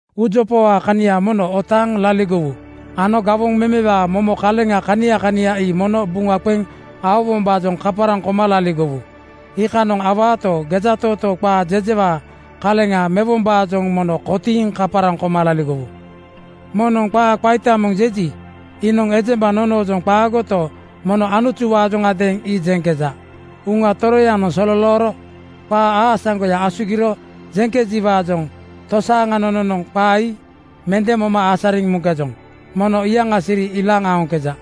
Uujopawaa kania mono otaaŋ laligowu ano gawoŋ memewaa momo kaleŋ kania kania ii mono buŋa qeŋ aowombaajoŋ kaparaŋ koma laligowu. Iikanoŋ awaato, gejatootoo qaa jejewaa kaleŋa mewombaajoŋ mono kotiiŋ kaparaŋ koma laligowu. Moŋnoŋ qaa qaita moŋ jeji, iinoŋ ejemba nonoojoŋ qaagoto, mono Anutuwaajoŋadeeŋ ii jeŋkeja. Uŋa Toroyanoŋ sololooro qaa aasaŋgoya asugiro jeŋkejiwaajoŋ tosaaŋa nononoŋ qaa ii mende moma asariŋ muŋkejoŋ. Mono iyaŋa siri ilaaŋ aoŋkeja.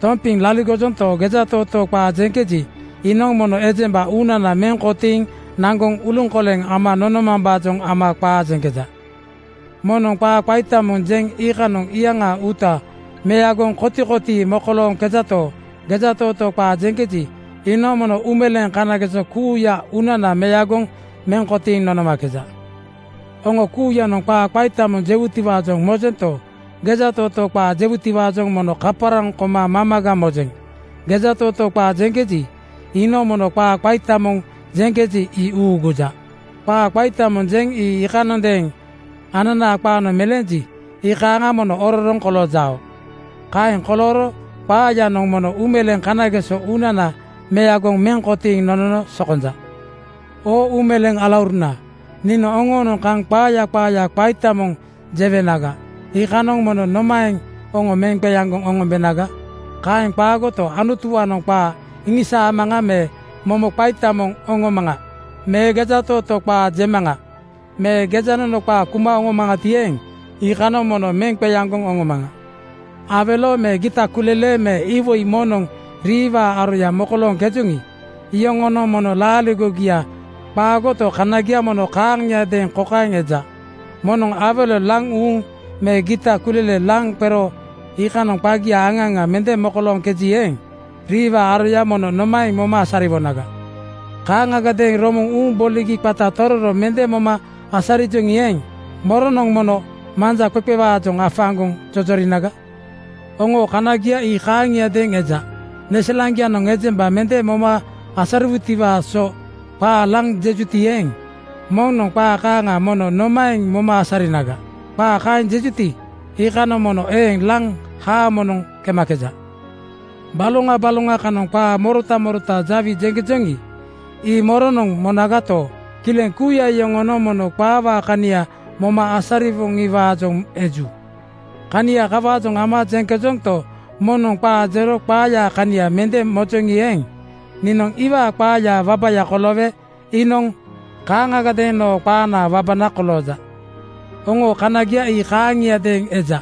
Tompiŋ laligojonto, gejatootoo qaa jeŋkeji, iinoŋ mono ejemba uunana meŋ kotiiŋ naŋgoŋ uluŋkoleŋ ama nonomambaajoŋ ama qaa jeŋkeja. Moŋnoŋ qaa qaita moŋ jeŋ iikanoŋ iyaŋaa uuta meagoŋ kotikotii mokolooŋkejato, gejatootoo qaa jeŋkeji, iinoŋ mono uumeleeŋ kanageso kuuya uunana meagoŋ meŋ kotiiŋ nonomakeja. Oŋo kuuyanoŋ qaa qaita moŋ jewutiwaajoŋ mojento, gejatootoo qaa jewutiwaajoŋ mono kaparaŋ koma mamaga mojeŋ. Gejatootoo qaa jeŋkeji, iinoŋ mono qaa qaita moŋ jeŋkeji, ii uuguja. Qaa qaita moŋ jeŋ ii iikanondeeŋ ananaa qaanoŋ meleenji, iikaaŋa mono ororoŋ koloojao. Kaeŋ kolooro qaayanoŋ mono uumeleeŋ kanageso uunana meagoŋ meŋ kotiiŋ nonono sokonja. Oo uumeleeŋ alauruna, niinoŋ oŋoonoŋ kaŋ qaaya qaaya qaita moŋ jewenaga, iikanoŋ mono nomaeŋ oŋo meŋ qeaŋgoŋ oŋombenaga? Kaeŋ qaagoto, Anutuwaanoŋ qaa iŋisaamaŋa me momo qaita moŋ oŋomaŋa me gejatootoo qaa jemaŋa me gejanono qaa kuma oŋomaŋati eeŋ, iikanoŋ mono meŋ qeaŋgoŋ oŋomaŋa. Awelo me gita kulele me iwoi moŋnoŋ riiwaa aroya mokolooŋkejoŋi, iyoŋonoŋ mono laaligogia qaagoto, kanagia mono kaaŋiadeeŋ kokaeŋ eja: Moŋnoŋ awelo laŋ uuŋ me gita kulele laŋ qero iikanoŋ qagia aŋa aŋa mende mokolooŋkeji eeŋ, riiwaa aroya mono nomaeŋ moma asariwonaga? Kaaŋagadeeŋ romoŋ uuŋ boligi qata tororo mende moma asarijoŋi eeŋ, moronoŋ mono manja qeqewaajoŋ afaaŋgoŋ jojorinaga? Oŋoo kanagia ii kaaŋiadeeŋ eja: Neselaŋgianoŋ ejemba mende moma asariwutiwaa so qaa laŋ jejuti eeŋ, moŋnoŋ qaa kaaŋa mono nomaeŋ moma asarinaga? Qaa kaeŋ jejuti, iikanoŋ mono eeŋ laŋ haamonoŋ kemakeja. Baloŋa baloŋa kanoŋ qaa morota morota dawi jeŋkejoŋi, ii moronoŋ monagato, kileŋ kuuya yoŋonoŋ mono qaawaa kania moma asariwoŋiwaajoŋ eju. Kania kawaajoŋ ama jeŋkejonto, moŋnoŋ qaa jero qaayaa kania mende mojeŋi eeŋ, niinoŋ iwaa qaayaa wabaya koloowe iinoŋ kaaŋagadeeŋ noo qaanaa wabana kolooja. Oŋoo kanagia ii kaaŋiadeeŋ eja: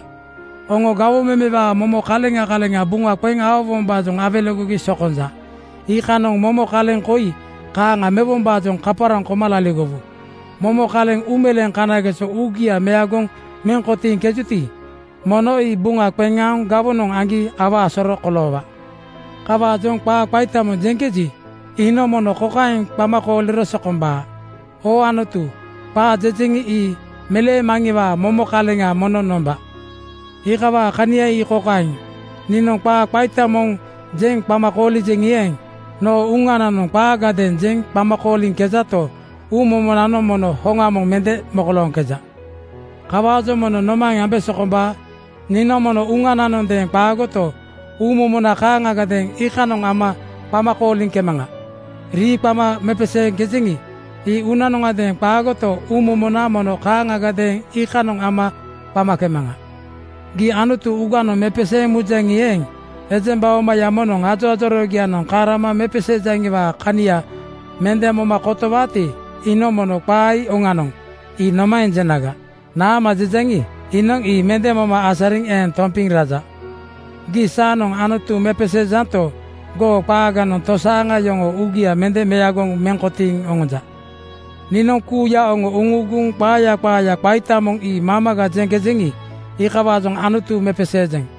Oŋo gawoŋ memewaa momo kaleŋa kaleŋa buŋa qeŋ aowombaajoŋ awelegogi sokonja. Iikanoŋ mono kaleŋ koi kaaŋa mewombaajoŋ kaparaŋ koma laligowu: Momo kaleŋ uumeleeŋ kanageso uugia meagoŋ meŋ kotiiŋkejuti, mono ii buŋa qeŋ aoŋ gawonoŋ aŋgi awaa soro koloowaa. Kawaajoŋ qaa qaita moŋ jeŋkeji, iinoŋ mono kokaeŋ qama kooliro sokombaa, “Oo Anutu, qaa jejeŋi, ii meleemaŋiwaa momo kaleŋa mono nomba.” Iikawaa kania ii kokaeŋ: Niinoŋ qaa qaita moŋ jeŋ qama koolijeŋi eeŋ, noo uŋananoŋ qaagadeeŋ jeŋ qama kooliŋkejato, uumomonanoŋ mono hoŋa moŋ mende mokolooŋkeja. Kawaajoŋ mono nomaeŋ ambe sokombaa? Niinoŋ mono uŋananondeeŋ qaagoto, uumomona kaaŋagadeeŋ iikanoŋ ama qama kooliŋkemaŋa. Rii qama mepeseeŋkejeŋi, ii uŋananondeeŋ qaagoto, uumomona mono kaaŋagadeeŋ iikanoŋ ama qamakemaŋa. Gii Anutu uŋaganoŋ mepeseeŋ mujaŋi eeŋ, ejemba omaya moŋnoŋ ajoajoroogianoŋ kaŋ rama mepeseejaŋiwaa kania mende moma kotowaati, iinoŋ mono “Qaa ii oŋanoŋ,” ii nomaeŋ jenaga? Naama jejaŋi, iinoŋ ii mende moma asariŋ eeŋ tompiŋ raja. Gii saanoŋ Anutu mepeseejanto, goo qaaganoŋ tosaaŋa yoŋoo uugia mende meagoŋ meŋ kotiiŋ oŋonja. Niinoŋ kuuya oŋo uŋuuguŋ qaaya qaaya qaita moŋ ii mamaga jeŋkejeŋi, iikawaajoŋ Anutu mepeseejeŋ.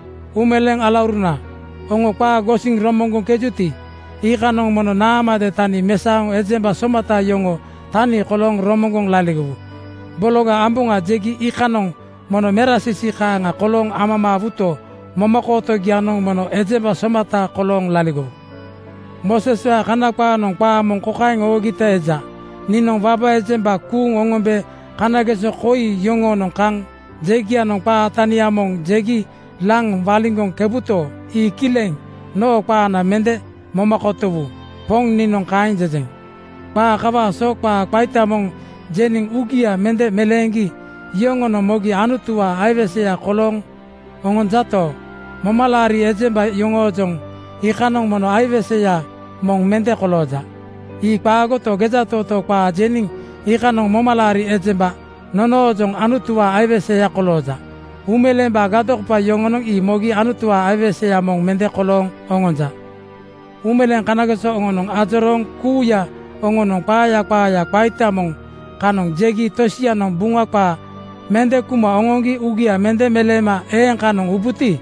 Uumeleeŋ alauruna, oŋo qaa gosiŋ romoŋgoŋkejuti, iikanoŋ mono naamade tani mesaoŋ ejemba somata yoŋoo tani kolooŋ romoŋgoŋ laligowu. Bologa amboŋa jegi iikanoŋ mono merasiisii kaaŋa kolooŋ amamaawuto, momakootogianoŋ mono ejemba somata kolooŋ laligowu. Mooseswaa Kana qaanoŋ qaa moŋ kokaeŋ oogita eja, “Niinoŋ waba ejemba kuuŋ oŋombe kanageso koi yoŋoonoŋ kaŋ jegianoŋ qaa tania moŋ jegi laŋ waliŋgoŋkebuto, ii kileŋ noo qaana mende moma kotowu. Poŋ niinoŋ kaeŋ jejeŋ.” Qaa kawaa so qaa qaita moŋ jeniŋ uugia mende meleeŋgi yoŋonoŋ mogi Anutuwaa aiweseya kolooŋ oŋonjato, momalaari ejemba nonoojoŋ iikanoŋ mono aiweseya moŋ mende kolooja. Ii qaagoto, gejatootoo qaa jeniŋ iikanoŋ momalaari ejemba nonoojoŋ Anutuwaa aiweseya kolooja. Uumeleembaa gadokopa yoŋonoŋ ii mogi Anutuwaa aiweseya moŋ mende kolooŋ oŋonja. Uumeleeŋ kanageso oŋonoŋ ajorooŋ kuuya oŋonoŋ qaaya qaaya qaita moŋ kanoŋ jegi tosianoŋ Buŋa qaa mende kuma oŋoŋgi uugia mende meleema eeŋ kanoŋ ubuti,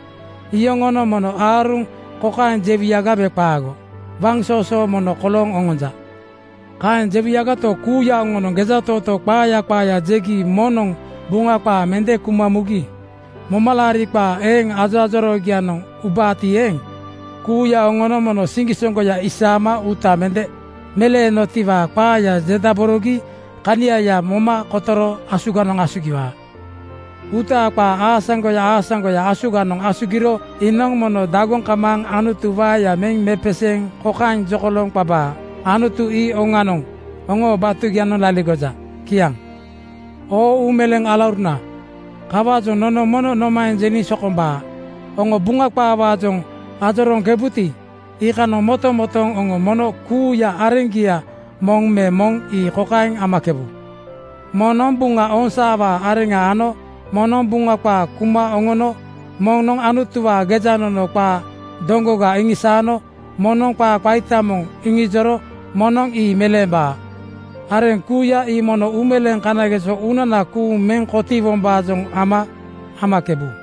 iyoŋonoŋ mono aaruŋ kokaeŋ jewuyaga me qaago, “Waŋsoosoo mono kolooŋ oŋonja.” Kaeŋ jewuyagato, kuuya oŋonoŋ gejatootoo qaaya qaaya jegi moŋnoŋ Buŋa qaa mende kuma mugi momalaaria qaa eeŋ ajoajoroogianoŋ ubaati eeŋ, kuuya oŋonoŋ mono siŋgisoŋgoya isaama uuta mende meleenotiwaa qaaya jedaborogi kaniaya moma kotoro asuganoŋ asugiwaa. Uutaa qaa aasaŋgoya aasaŋgoya asuganoŋ asugiro iinoŋ mono dagoŋ kamaaŋ Anutu waeya meŋ mepeseeŋ kokaeŋ jokolooŋ qabaa, “Anutu ii oŋanoŋ oŋoo batugianoŋ laligoja.” Kiaŋ. Oo uumeleeŋ alauruna, kawaajoŋ nono mono nomaeŋ jeniŋ sokombaa? Oŋo Buŋa qaawaajoŋ ajorooŋkebuti, iikanoŋ motomotooŋ oŋo mono kuuya areŋgia moŋ me moŋ ii kokaeŋ amakebu: Moŋnoŋ Buŋa ooŋsaawaa areŋa ano moŋnoŋ Buŋa qaa kuma oŋono moŋnoŋ Anutuwaa gejanono qaa doŋgoga iŋisaano moŋnoŋ qaa qaita moŋ iŋijoro moŋnoŋ ii meleembaa. Areŋ kuuya ii mono uumeleeŋ kanageso uunana kuuŋ meŋ kotiiwombaajoŋ ama amakebu.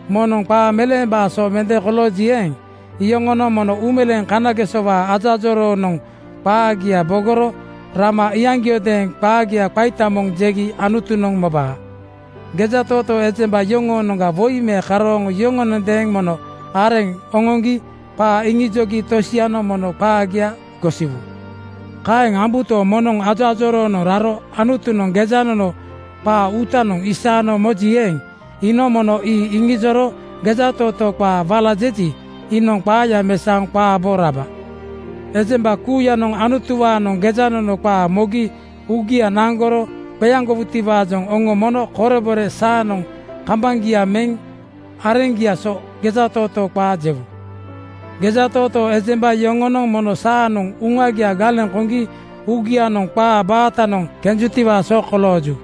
Moŋnoŋ qaa meleemambaa so mende kolooji eeŋ, iyoŋonoŋ mono uumeleeŋ kanagesowaa ajoajoroonoŋ qaagia bogoro rama iyaŋgiaajoŋadeeŋ qaagia qaita moŋ jegi Anutunoŋ mobaa. Gejatootoo ejemba yoŋoonoŋga woi me karooŋ yoŋonondeeŋ mono areŋ oŋoŋgi qaa iŋijogi tosianoŋ mono qaagia gosiwu. Kaeŋ ambuto, moŋnoŋ ajoajoroonoŋ raro Anutunoŋ gejanono qaa uutanoŋ isaano moji eeŋ, iinoŋ mono ii iŋijoro gejatootoo qaa wala jeji, iinoŋ qaaya mesaoŋ qaa bo raba. Ejemba kuuyanoŋ Anutuwaanoŋ gejanono qaa mogi uugia naŋgoro qeaŋgowutiwaajoŋ oŋo mono korebore saanoŋ kambaŋgia meŋ areŋgiaa so gejatootoo qaa jewu. Gejatootoo ejemba yoŋonoŋ mono saanoŋ uŋagia galeŋ koŋgi uŋagianoŋ qaa baatanoŋ kenjutiwaa so kolooju.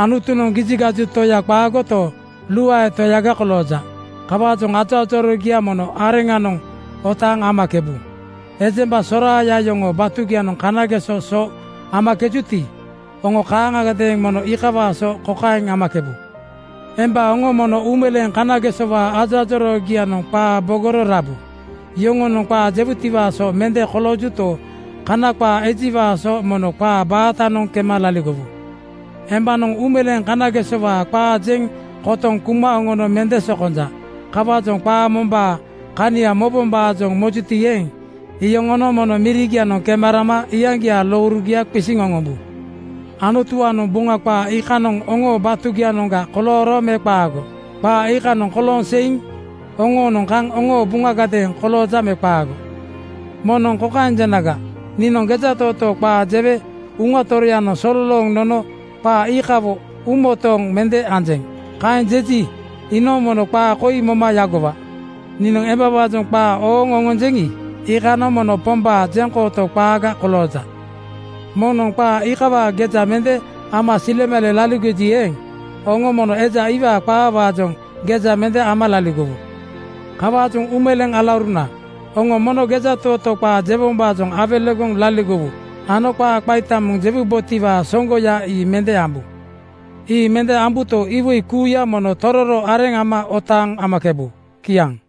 Anutunoŋ gijigaju Toya qaagoto, luae Toyaga kolooja. Kawaajoŋ ajoajoroogia mono areŋanoŋ otaaŋ amakebu. Ejemba soraaya yoŋoo batugianoŋ kanageso so amakejuti, oŋo kaaŋagadeeŋ mono iikawaa so kokaeŋ amakebu: Emba oŋo mono uumeleeŋ kanagesowaa ajoajoroogianoŋ qaa bogoro rabu. Yoŋonoŋ qaa jewutiwaa so mende koloojuto, Kana qaa ejiwaa so mono qaa baatanoŋ kema laligowu. Embanoŋ uumeleeŋ kanagesowaa qaa jeŋ kotoŋ kuma oŋono mende sokonja. Kawaajoŋ qaa mombaa kania mobombaajoŋ mojuti eeŋ, iyoŋonoŋ mono mirigianoŋ kema rama aŋgiaa lourugia qisiŋ oŋombu. Anutuwaanoŋ Buŋa qaa iikanoŋ oŋoo batugianoŋga kolooro me qaago? Qaa iikanoŋ kolooŋ seiŋ oŋoonoŋ kaŋ oŋoo buŋagadeeŋ kolooja me qaago? Moŋnoŋ kokaeŋ jenaga, “Niinoŋ gejatootoo qaa jewe Uŋa Toroyanoŋ sololooŋ nono qaa iikawo uumotooŋgo mende anjeŋ.” Kaeŋ jeji, iinoŋ mono qaa koi moma yagowa: Niinoŋ embawaajoŋ qaa ooŋ oŋonjeŋi, iikanoŋ mono Pombaa jeŋkooto qaaga kolooja. Moŋnoŋ qaa iikawaa geja mende ama silemale laligoji eeŋ, oŋo mono eja iwaa qaawaajoŋ geja mende ama laligowu. Kawaajoŋ uumeleeŋ alauruna, oŋo mono gejatootoo qaa jewombaajoŋ awelegoŋ laligowu ano qaa qaita moŋ jewubotiwaa soŋgoya ii mende ambu. Ii mende ambuto, iwoi kuuya mono tororo areŋ ama otaaŋ amakebu. Kiaŋ.